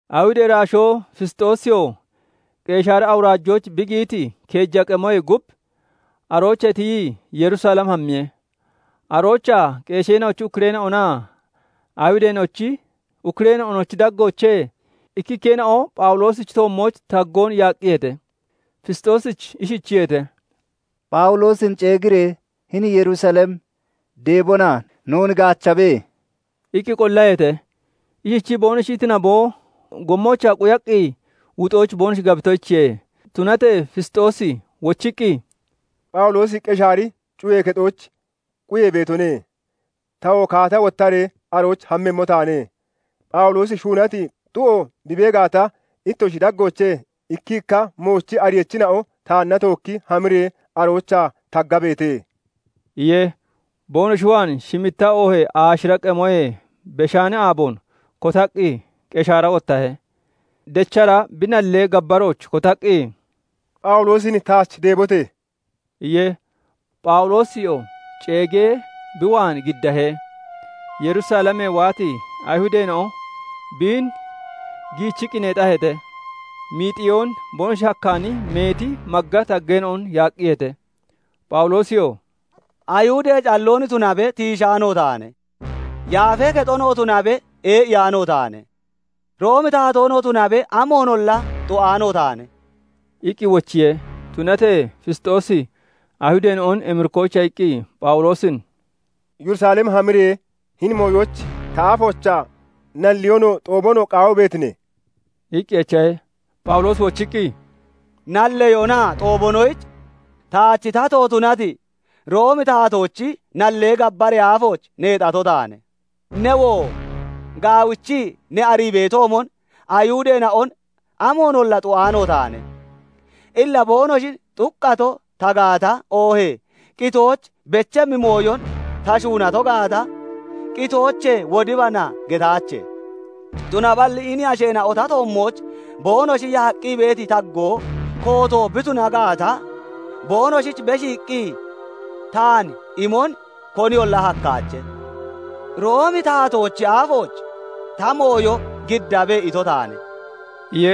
Ayihudee iraashoo Fisxoosiyoo Qeshaari awuraajooch bi giyiti keeja qemoyee gub, aroochee tiyii Yerusalem hammiye. Aroochaa qeesheena'ochi ukkureena'onaa Ayihudeena'ochi ukkureena'onochi daggoochee ikkikkeena'o Phawuloosichi toommooch taggoon yaaqqiyeete. Fisxoosich ishichiyeete:- "Phawuloosin ceeggiiree hini Yerusalem deebona noon gaachabe!" iqqi qollaheete. Ishichii boonoshi iti naboo, gommoochaa quyaqqi wuxoyich boonoshi gabitoyichiye. Tunatee Fisxoosi wochiqqi, "Phawuloosi Qeshaari cuyee kexooch quyee beetone; tawoo kaata wottaree arooch hammemmo taane; Phawuloosi shuunati xu'o bi bee gaata, ittoshi daggoochee ikkikka moochi ariyachina'o taanna tookki hamiree aroochaa taggabeete!" iye. Boonoshi waan shimitta oohee aashira qemoyee beshaani aaboon kotaqqi, Qeshaara wottahe. Dechara bi nallee gabbarooch kotaqqi, "Phawuloosin taach deebote!" iye. Phawuloosiyoo ceegee bi waan giddahe; Yerusalemee waati Ayihudeena'o biin giichiqqi neexaheete; miixiyoon boonoshi hakkaani meeti magga taggeena'on yaaqqiyeete. Phawuloosiyoo "Ayihudee calloon tunabe tiishaano taane; Yaafee Kexonoo tunabe ee'iyaano taane; Roomi taatoonoo tunabe amoonolla xu'aano taane" iqqi wochiye. Tunatee Fisxoosi Ayihudeena'on emirikkoyicha iqqi, Phawuloosin "Yerusalem hamiree hini mooyoyich ta afoochaa nalleyoonoo, xoobonoo qaawii beetine?" iqqi echahe. Phawuloosi wochiqqi, "Nalleyoonaa xoobonoyich taach tato tunati Roomi taatoochi nallee gabbaree aafooch neexato taane. Newoo gaawichii ne arii beetoomon Ayihudeena'on amoonolla xu'aano taane. Illa boonoshin xuqqato ta gaata, oohee qitooch bechemmi mooyon ta shuunato gaata, 'Qitoochee wodibana!' getaache; tunaballi hini asheena'o ta toommooch boonoshi yaaqqi beeti taggoo kooto bi tuna gaata, boonoshich beshiiqqi taan imon koniyolla hakkaache. 'Roomi taatoochi aafooch ta mooyo giddabe!' ito taane" iye.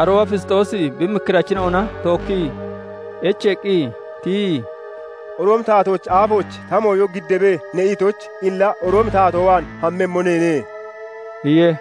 Arooba Fisxoosi bi mikkirachina'ona tookkii echeeqqi tiyii, " 'Roomi taatoochi aafooch ta mooyo giddabe' ne itoyich, illa Roomi taatoo waan hammemmo neene" iye.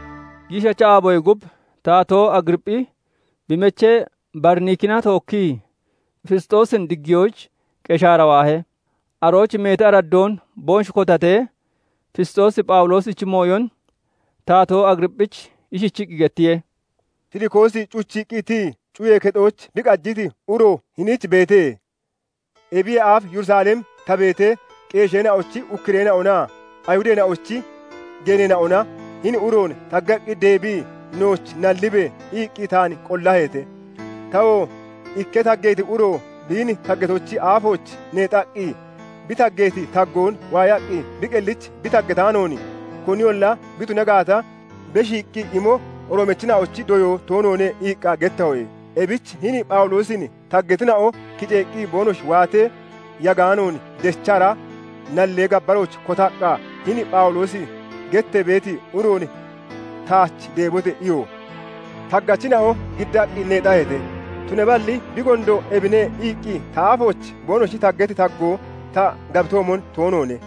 Giishacha aaboyee gub Taatoo Agiriipphi bi mechee Bariniikina tookkii Fisxoosin diggiyoyich Qeshaara waahe. Arooch meeti araddoon boonoshi kotatee, Fisxoosi Phawuloosichi mooyon Taatoo Agiriipphich ishichiqqi gettiye:- "Filikoosi cuchiiqqi tiyii cuyee kexooch bi qajiti uro hiniich beete. Ebiyee aaf Yerusalem ta beetee, qeesheena'ochi ukkureena'onaa Ayihudeena'ochi geeneena'ona hini uroon taggaqqi deebii, 'Nooch nallibe!' iqqi taan qollaheete. "Tawoo 'Ikka taggeeti uro biin taggatochi aafooch neexaqqi, bi taggeeti taggoon waayaqqi bi qellich bi taggataanoon, koninolla bi tuna gaata, beshiiqqi imo Roomachina'ochi doyoo toonoone' iqqa gettaho. "Ebich hini Phawuloosin taggatina'o kiceeqqi boonoshi waatee, yagaanoon dechara nallee gabbarooch kotaqqa, 'Hini Phawuloosi gettee beeti uroon taach deebote!' iyo. Taggachina'o giddaqqi neexaheete; tunaballi 'Bi gondo ebine' iqqi ta aafooch boonoshi taggati taggoo ta gabitoomon toonoone.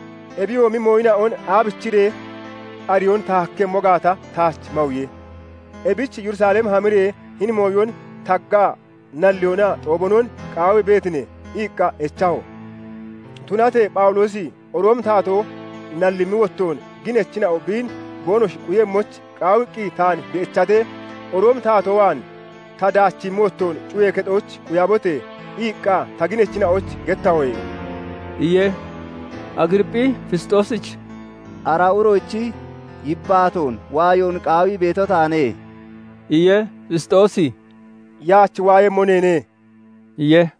Ebiyoomi mooyina'on aabichiree ariyoon ta hakkemmo gaata taach mawiye; ebich 'Yerusalem hamiree hini mooyon taggaa nalleyoonaa xoobiyoonon qaawii beetine?' iqqa echaho. "Tunatee Phawuloosi Roomi Taatoo nallimmi wottoon, ginachina'o biin boonoshi quyemmoyich qaawiqqi taan bi echatee, 'Roomi taatoo waan ta daachimmi wottoon cuyee kexooch quyabote!' iqqa ta ginachina'oyich gettahoye" iye. Agiriipphi Fisxoosich "Ara uroochi yibbaatoon waayon qaawii beeto taane" iye. Fisxoosi "Yaach waayemmo neene" iye.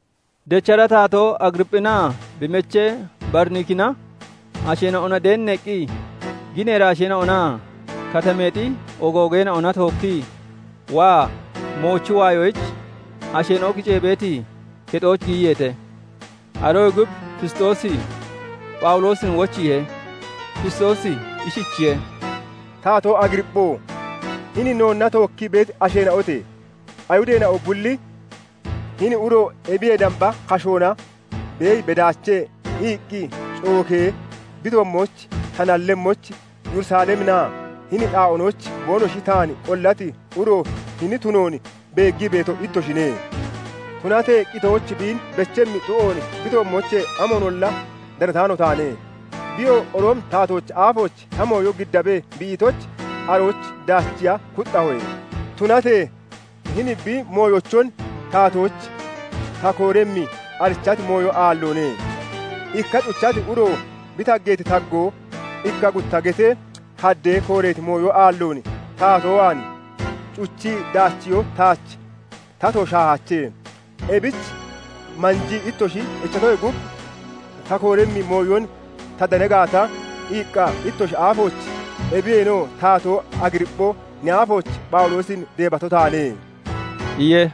Dechara Taatoo Agiriipphinaa bi mechee Bariniikinaa asheena'ona deenneeqqi, ginee iraasheena'onaa katameexi ogoogeene'ona tookkii waa moochi waayoyich, asheena'o kicee beeti kexooch giyiyeete. Aroyee gub Fisxoosi Phawuloosin wochiihe. Fisxoosi ishichiye:- "Taatoo Agiriippho! Hini noonna tookkii beeti asheena'ote! Ayihudeena'o bulli 'Hini uro ebiyee damba kashoona beeyi bedaache' iqqi cookee bi toommooch ta nallemmoyich, Yerusaleminaa hini xaa'oonooch boonoshi taan qollati uro hini tunoon beeggii beeto ittoshine. Tunatee qitooch biin bechemmi xu'oon bi toommoochee amoonolla danataano taane. Biyoo 'Roomi taatoochi aafooch ta mooyo giddabe' bi itoyich, arooch daachiiya kuxxahoye. Tunatee hini bi mooyochon taatoyich ta kooremmi, arichati mooyo aalloone. Ikka cuchati uro bi taggeeti taggoo ikka gutta getee haddee kooreeti mooyo aalloon, taatoo waan cuchii daachiyoo taach tato shaahaache. Ebich manjii ittoshi echatoyee gub, ta kooremmi mooyon ta dana gaata iqqa, ittoshi aafooch, ebiyeenoo Taatoo Agiriippho! Ne aafooch, Phawuloosin deebato taane" iye.